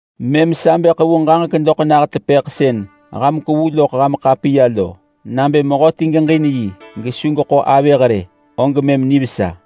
Mëm sa bë ḳevu ġaġek doḳ nah tepëḳ sën ham kwevu loḳ ham ḳapiya lo. Nabë mehöti geġin yi gesu geḳo avëh rë, og mëm nivesa.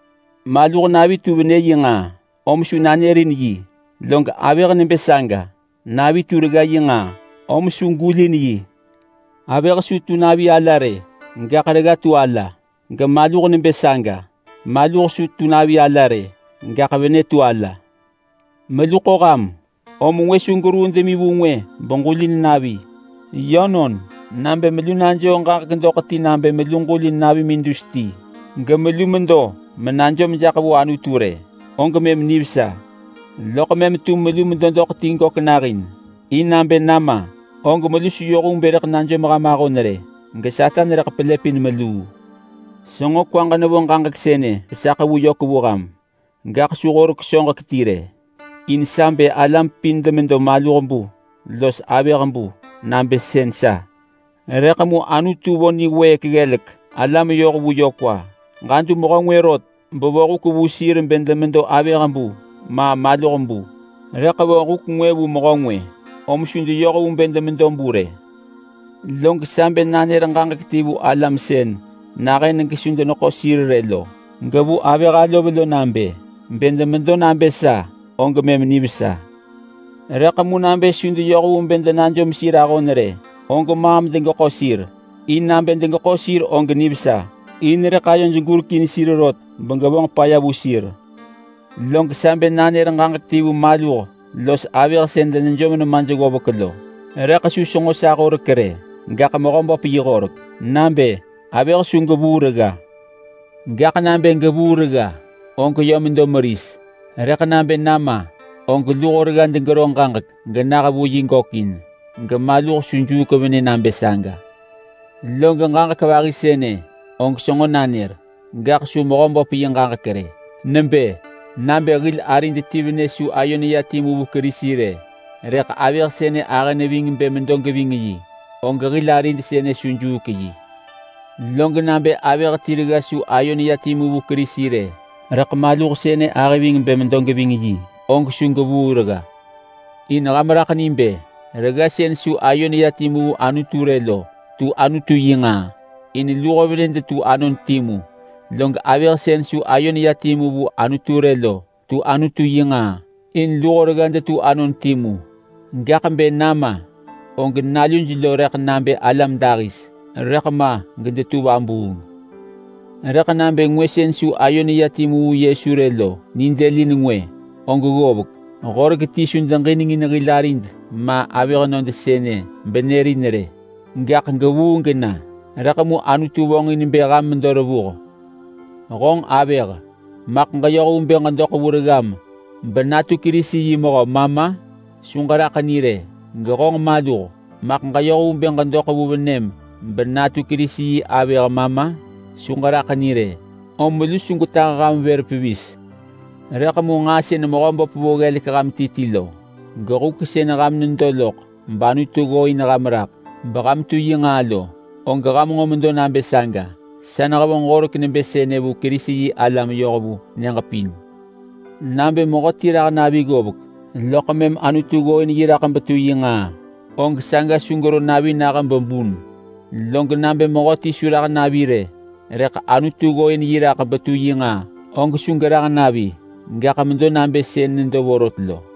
Maluh navi tu venë yi nġaa, om su nanërin yi. Log avëh nebë saga, navi tu regga yi nġaa om su gulin yi. Avëh su tu navi ala rë, gaḳ regga tu ala. Gemaluh nebë saga, maluh su tu navi ala rë, gaḳ venë tu ala. Melu ḳo ham om ngwë su geruu demi vu ngwë begulin navi. Yönon, nabë melu najoo ġaġek doḳ ti nabë melu ġulin navimin dus ti gemelu medo menajom jaḳ vu Anutu rë, og mëm nivesa. Loḳ mëm tum melu medo doḳ ti gök nahin, in nabë nama og melu su yoh vu bë rëḳ najom ham ahon rë geSatan rëḳ pelëpin meluu. Senġo kwaġ nevo ġaġek sënë besa ḳevu yök vu ham, gaḳ su horek soġek ti rë, in sa bë alam pin demedo maluh bu los avëh bu nabë sën sa. Rëḳ mu Anutu vo niwëëk ggelek alam yoh vu yö kwa. Ġadu mehö ngwë rot bevo huk vu sir bë demedo avëh bu, ma maluh bu, rëḳ vo huk ngwë vu mehö ngwë om su deyoh vu bë demedo bu rë. Log sa bë nanër ġaġek ti vu alam sën nahën gesu deneḳo sir rë lo, gevu avëh alov nabë: Bë demedo nabë sa, og mëm nivesa. Rëḳ mu nabë su deyoh vu bë denajom sir ahon rë, og maam degeḳo sir. In nabë degeḳo sir og nivesa, in rëḳ ayoj gurekin sir rot begevonġ paya vu sir. Log sa bë nanër ġaġek ti vu maluh los avëh sën denejom nemaj ggovek lo, rëḳ su senġo sa horek rë gaḳ Mehöböp yi horek. Nabë: Avëh su gevuu regga! Gaḳ nabë gevuu regga, og yö medo meris. Gaḳ nabë nama, og luho regga degero ġaġek genah vu yi gökin. Gemaluh su juuk venë nabë saga! Log ġaġek vahi sënë og senġo nanër, gaḳ su Mehöböp yi ġaġek rë. Nebë: Nabë hil arid ti venë su ayo neya timu vu Kerisi rë, rëḳ avëh sënë ahë ving bë medo geving yi, og hil arid sënë su juuk yi. Log nabë avëh ti regga su ayo neya timu vu Kerisi rë, rëḳ maluh sënë ahë ving bë medo geving yi, og su gevuu regga. In ham raḳ ni, mehö sën su ayo neya timu vu yi rë lo tu Anutu yi nġaa, in luho venë detu anon timu, log avëh sën su ayo neya timu vu yi rë lo tu Anutu yi nġaa, in luho regga detu anon timu. Gaḳ bë nama, og naluj lo rëḳ nabë alam dahis, rëḳ ma gedetu vabuung. Rëḳ nabë ngwë sën su ayo neya timu vu Yesu rë lo nidëlin ngwë og ggovek. Horek ti su deġinengin hil arid ma avëhnöd sënë benërin rë, gaḳ gevuu gena. Rëḳ mu Anutu vonġin bë ham medo revuh. Honġ avëh! Maḳ ġeyoh vu bë ġedoḳ vu reggam benatu Kerisi yi mehö ma ma? Su ġeraḳ ni rë! Gehonġ maluh! Maḳ ġeyoh vu bë ġedoḳ vu venëm benatu Kerisi yi avëh ma ma? Su ġeraḳ ni rë! Om melu su gwetah ham vër pevis rë. Rëḳ mu nġaa sën Mehöböp vo ggelek ham ti ti lo, gehuk sën ham nedo loḳ bAnutu ggooin ham raḳ beham tu yi nġaa lo, og ham nġo medo nabë saga. Sa nehevonġ horek nebë sënë vu Kerisi-yi-alam yoh vu nyëġ pin. Nabë mehöti rah navi ggovek loḳ mëm Anutu ggooin yi raḳ betu yi nġaa, og saga su gero navi nah bebun. Log nabë mehöti su rah navi rë rëḳ Anutu ggooin yi raḳ betu yi nġaa, og su gerah navi, gaḳ medo nabë sën nedo vorot lo.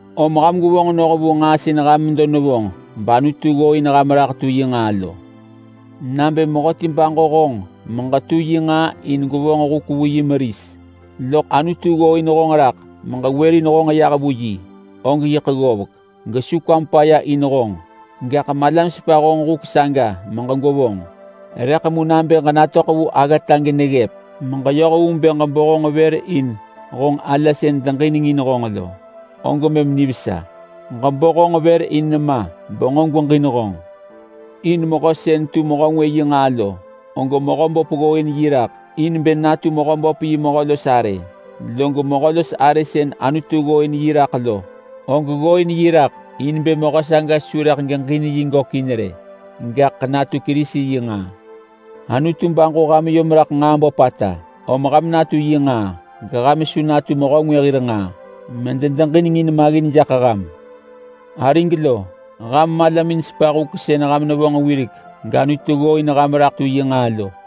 Om ham gwevonġ noh vu nġaa sën ham medo nevonġ bAnutu ggooin ham raḳ tu yi nġaa lo. Nabë mehöti baġo honġ meġetu yi nġaa in gwevonġ huk vu yi meris, loḳ Anutu ggooin honġ raḳ meġewërin honġ yah vu yi, og yiḳ ggovek gesu kwam paya in honġ, gaḳ malam sepa honġ huk saga megwevonġ. Rëḳ mu nabë ġenatöḳ vu aggata geneggëp meġeyoh vu bë ġebo honġ vër in honġ ala sën deġinengin honġ lo, og mëm nivesa. Ġebo honġ vër in nema benġo gweġin honġ. In mehö sën tu mehö ngwë yi nġaa lo, og Mehöböp ggooin yi raḳ in bë natu Mehöböp yi mehö los arë. Log mehö los arë sën Anutu ggooin yi raḳ lo, og ggooin yi raḳ in bë mehö saga su rëḳ geġin yi gökin rë, gaḳ natu Kerisi yi nġaa. Anutu baġo ham yom raḳ nġaa böpata, om ham natu yi nġaa geham su natu mehö ngwë hir nġaa mededeġinengin maggin jaḳ ham. Arig lo, ham malamin sepa huk sën ham nevonġ wirek gAnutu ggooin ham raḳ tu yi nġaa lo.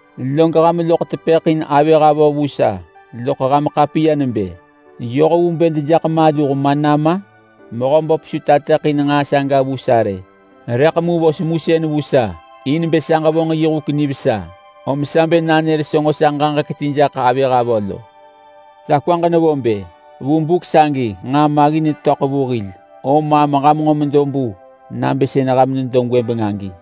Log ham loḳ tepëḳ in avëh avö vu sa loḳ ham ḳapiya nebë, “Yoh vu bë dejaḳ maluh ma nama?” Mehöböp su tateḳin nġaa saga vu sa rë, rëḳ mu vo semusën vu sa in bë sa ġevonġ yi huk nivesa, om sa bë nanër senġo sa ġaġek ti jaḳ avëh avö lo. Sa kwaġ nevo bë: Vu buk sagi nġaa maggin netöḳ vu hil, om maam ham nġo medo bu nabë sën ham nedo gwëbeng agi.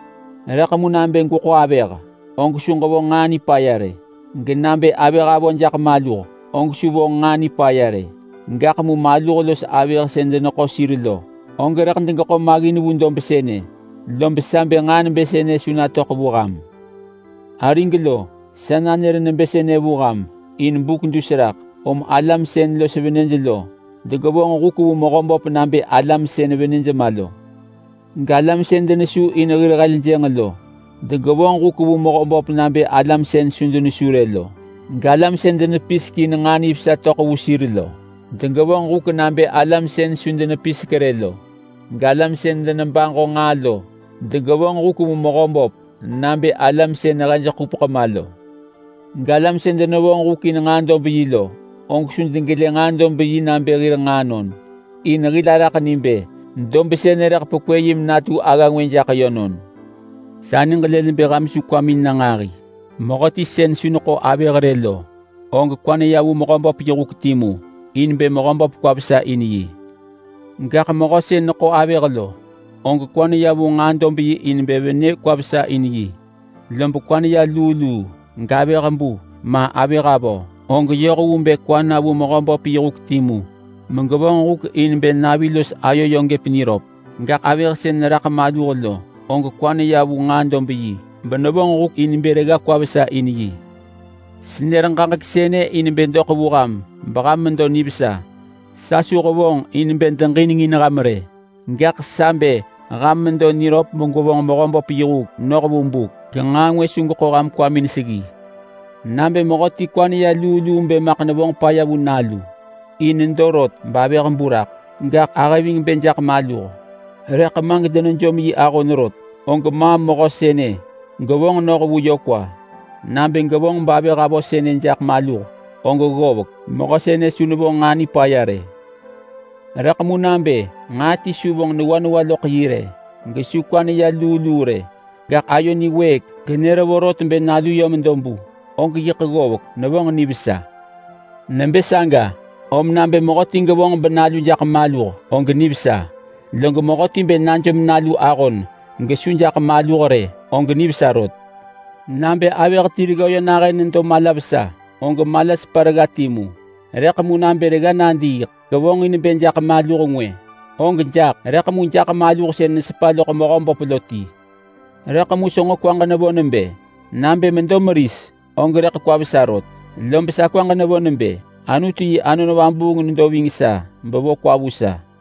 Rëḳ mu nabë gweḳo avëh, og su ġevonġ nġaa nipaya rë. Genabë avëh avö jaḳ maluh, og su vonġ nġaa nipaya rë. Gaḳ mu maluh los avëh sën deneḳo sir lo, og rëḳ degeḳo maggin vu dob sënë, lob sa bë nġaa nebë sënë su natöḳ vu ham. Arig lo, sa nanër nebë sënë vu ham in buk dus raḳ. Om alam sën los venëj lo degevonġ huk vu Mehöböp nabë alam sën venëj ma lo. Galam sën denesu in hir heljënġ lo degevonġ huk vu Mehöböp nabë alam sën su denesu rë lo. Galam sën denepisek in nġaa nivesa töḳ vu sir lo, degevonġ huk nabë alam sën su denepisek rë lo. Galam sën denebaġo nġaa lo degevonġ huk vu Mehöböp nabë alam sën hej ḳupeḳ ma lo. Galam sën denevonġ huk in nġaa dob yi lo, og su degelë nġaa dob yi nabë hir nġaanon. In hil araḳ ni bë dob sënë rëḳ pekwë yi menatu agga ngwë jaḳ yönon. Sa niġ lël bë ham su kwamin na nġahi. Mehöti sën su neḳo avëh rë lo, og kwa neya vu Mehöböp yi huk timu in bë Mehöböp kwa vesa in yi. Gaḳ mehö sën neḳo avëh lo, og kwa neya vu nġaa dob yi in bë venë kwa vesa in yi, lob kwa neya luu luu. Gavëh bu ma avëh avö, og yoh vu bë kwa na vu Mehöböp yi huk timu megevonġ huk in bë navi los ayo yö gëp niröp. Gaḳ avëh sën neraḳ maluh lo, og kwa neya vu nġaa dob yi benevonġ huk in bë regga kwa vesa in yi. Senër ġaġek sënë in bë doḳ vu ham beham medo nivesa. Sa su hevonġ in bë deġinengin ham rë, gaḳ sa bë ham medo niröp begwevonġ Mehöböp yi huk noh vu buk, genġaa ngwë su geḳo ham kwamin seggi. Nabë mehöti kwa neya luu luu bë maḳ nevonġ paya vu nalu in nedo rot bavëh bu raḳ, gaḳ ahë ving bë jaḳ maluh rëḳ ma gedenejom yi ahon rot, og maam mehö sënë gevonġ noh vu yö kwa. Nabë gevonġ bavëh avö sënë jaḳ maluh, og ggovek, mehö sënë su nevonġ nġaa nipaya rë. Rëḳ mu nabë nġaa ti su vonġ newa newa loḳ yi rë gesu kwa neya luu luu rë, gaḳ ayo niwëëk genër vorot bë nalu yö medo bu, og yiḳ ggovek, nevonġ nivesa. Nebë saga om nabë mehöti gevonġ menalu jaḳ maluh og nivesa. Log mehöti bë najom nalu ahon gesu jaḳ maluh rë, og nivesa rot. Nabë avëh ti regga yö nahën nedo mala vesa, og mala sepa regga timu. Rëḳ mu nabë regga nadiiḳ gevonġin bë jaḳ maluh ngwë, og jaḳ. Rëḳ mu jaḳ maluh sën nesepa loḳ Mehöböp lo ti. Rëḳ mu senġo kwaġ nevo nebë: Nabë medo meris, og rëḳ kwa vesa rot. Lob sa kwaġ nevo nebë Anutu yi Anon Vabuung nedo ving sa bevo kwa vu sa.